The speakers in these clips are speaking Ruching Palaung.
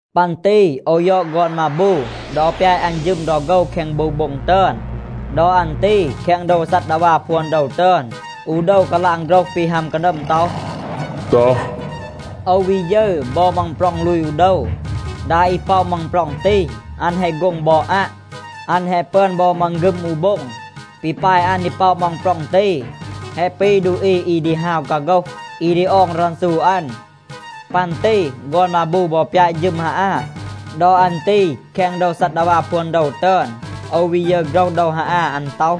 ปัน ตี โอว ยอด ฆอน มาบู ดอ ปยาต อัน ฌึม ดอ โฆว แคง บู โบ็ง ตึอน. ดอ อัน ตี แคง โดว ซัดดาวา พวน โดว ตึอน, อู โดว กาลาง โฆรห ปี ฮัม กานัม ต็อห, “ตัห.” โอว วี ยึร บอ มังปร็อง ลูย อู โดว. ดา อี ป็อะ มังปร็อง ตี, อัน แฮะ โฆ็ง บอ อัะ. อัน แฮะ ปึอน บอ มังฆึม อู โบ็ง. ปี ปาย อัน ดี ป็อะ มังปร็อง ตี แฮะ ปี ดูอี อี ดี ฮาว กาโฆห, อี ดี ออง รันซู อัน. ปัน ตี ฆอน มาบู บอ ปยาต ฌึม ฮาอา. ดอ อัน ตี แคง โดว ซัดดาวา พวน โดว ตึอน, โอว วี ยึร โฆรห โดว ฮาอา. อัน ต็อห,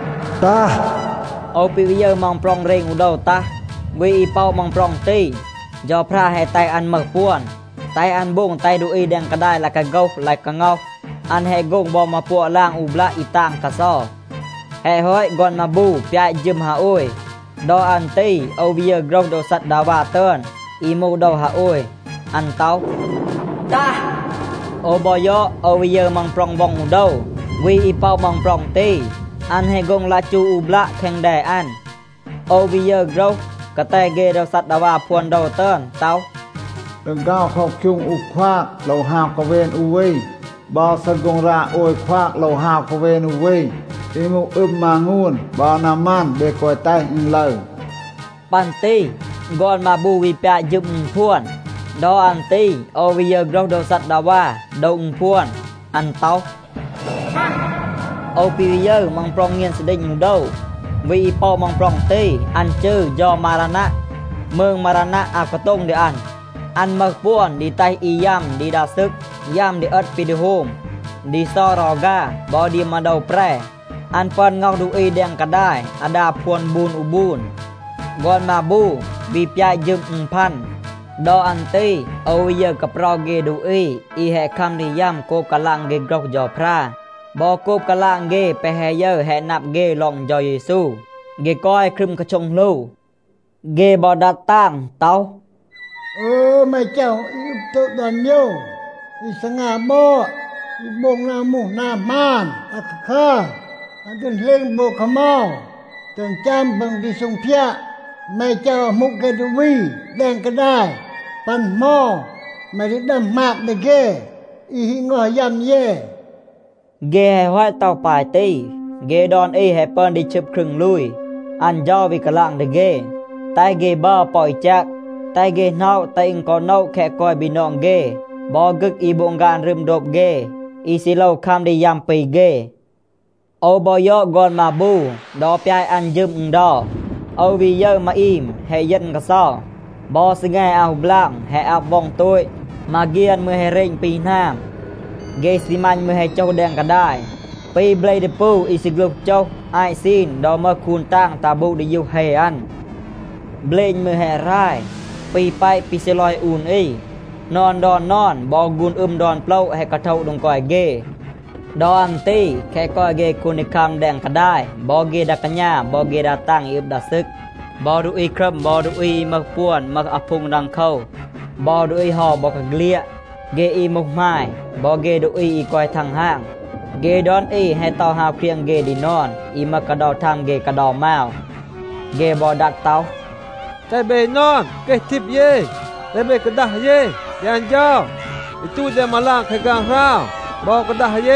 “ตัห.” โอว ปี วี ยึร มังปร็อง เรณ อู โดว ตัห. วี อี ป็อะ มังปร็อง ตี, เฌาพรา แฮะ แตห อัน มึห ปวน, แตห อัน โบง แตห ดูอี แดง กาดาย ลาย กาโฆห ลาย กาง็อห. อัน แฮะ โฆ็ง บอ มาปัวะ ลาง อู บลัะ อี ตาง กาเซา. แฮะ ฮอต, ฆอน มาบู ปยาต ฌึม ฮาโอย. ดอ อัน ตี โอว วี ยึร โฆรห โดว ซัดดาวา ตึอน, อี มูห โดว ฮาโอย. อัน ต็อห, “ตัห.” โอว บอ ยอด, โอว วี ยึร มังปร็อง ว็อง อู โดว. วี อี ป็อะ มังปร็อง ตี, อัน แฮะ โฆ็ง ลัะจู อู บลัะ แคง แด อัน. โอว วี ยึร โฆรห กาแต เฆ โดว ซัดดาวา พวน โดว ตึอน ต็อห, “ดีฆาว เคาคยูง อู ควาก, โลว ฮาว กาเวน อู วี. บอ ซีโฆ็งรา โอย ควาก, โลว ฮาว กาเวน อู วี. อี มูห อึม มางูน บอ นามัน, เบ แกวะ แตห อึณ ลึร.” ปัน ตี ฆอน มาบู วี ปยาต ฌึม อึณพวน. ดอ อัน ตี โอว วี ยึร โฆรห โดว ซัดดาวา โดว อึณพวน, อัน ต็อห, “ตัห.” โอว ปี วี ยึร, มังปร็อง เงียน ซีดีณ อู โดว. วี อี ป็อะ มังปร็อง ตี, อัน จืร เฌา มารานัะ. มืง มารานัะ อาว กาโต็ง ดี อัน. อัน มึห ปวน ดี แตห อี ยัม ดี ดา ซึก, ยัม ดี เอต ปี ดี โฮม, ดี เซา รอฆา บอ ดี มา โดว แปร. อัน ปึอน ง็อห ดูอี แดง กาดาย อาดา พวน บูน อู บูน. ฆอน มาบู วี ปยาต ฌึม อึณพัน. ดอ อัน ตี โอว วี ยึร กาเปรา เฆ ดูอี อี แฮะ คัม ดี ยัม โกบ กาลาง เฆ โฆรห เฌาพรา บอ โกบ กาลาง เฆ แปะ แฮะ ยึร แฮะ นับ เฆ ลอง เฌา เยซู. เฆ กอย ครึม กาโช็ง หลู. เฆ บอ ดัด ตาง ต็อห, “อึย แม เฌา อี อึบ โตต ดอน โมยว อี ซีงา บอด, อี โบง นา มูห นา หมาน อาคาคัร, อึณ ดี เหลณ ปอ แคะ เหมา, แตห อึณ ฌัม ปัน ดี ซูงพยาด แม เฌา อามู เฆ ดูอี แดง กาดาย? ปัน เหมา แม ดี ดัม หมาบ ดี เฆ อี แฮะ ง็อห ยัม เย?” เฆ แฮะ ฮอต ต็อห ปาย ตี, เฆ ดอน อี แฮะ ปึอน ดี ชึบ ครึง ลูย. อัน เฌา วี กาลาง ดี เฆ, แตห เฆ บัร ปอ อี แจก. แตห เฆ หน็อะ, แตห อึณ กอ โนะ แคะ กอย บีนอง เฆ บอ ฆึก อี โบง ฆาน รึม โดบ เฆ, อี ซี โลว คัม ดี ยัม ปี เฆ. โอว บอ ยอด ฆอน มาบู ดอ ปยาต อัน ฌึม อึณเดา. โอว วี ยึร มาอีม แฮะ เยณ กาเซา. บอ ซีแง อาว ฮู บลาง, แฮะ อับ ว็อง โตต. มาเฆียน มืร แฮะ เรณ ปี หนาม. เฆ ซีมัณ มืร แฮะ โจห แดง กาดาย, ปี เบล ดีปู อี ซีฆลูห โจห อาต ซีน ดอ มึห คูน ตาง ตัห บูด ดียูห เฮ อัน. เบลณ มืร แฮะ หราย ปี แปะ ปี ซีลอย อูน อี. นอน ดอน นอน บอ ฆูน อึม ดอน โปละ แฮะ กาโทะ โดง กอย เฆ. ดอ อัน ตี แคะ กอย เฆ คูนดีคัม แดง กาดาย บอ เฆ ดา กาณา, บอ เฆ ดา ตาง อี อึบ ดา ซึก, บอ ดูอี ครัม บอ ดูอี อี มึห ปวน, มึห อาพูง ดังโคว, บอ ดูอี เฮา บอกาเฆลียด, เฆ อี มูห หมาย บอ เฆ ดูอี อี กอย ทังฮาง, เฆ ดอน อี แฮะ เตา ฮาว เครียง เฆ ดี นอน อี มึห กาเดา มาว เฆ กาเดา มาว. เฆ บอ ดัด ต็อห, “แตห เบ นอน เกห ทีบ เย, แตห เบ กาดัห เย ดี อัน เฌา อี ตูต แดง มาลาง แคง ฆางหราว, บอ กาดัห เย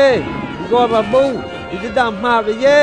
ดี ฆอน มาบู อี ดี ดัม หมาบ ดี เย.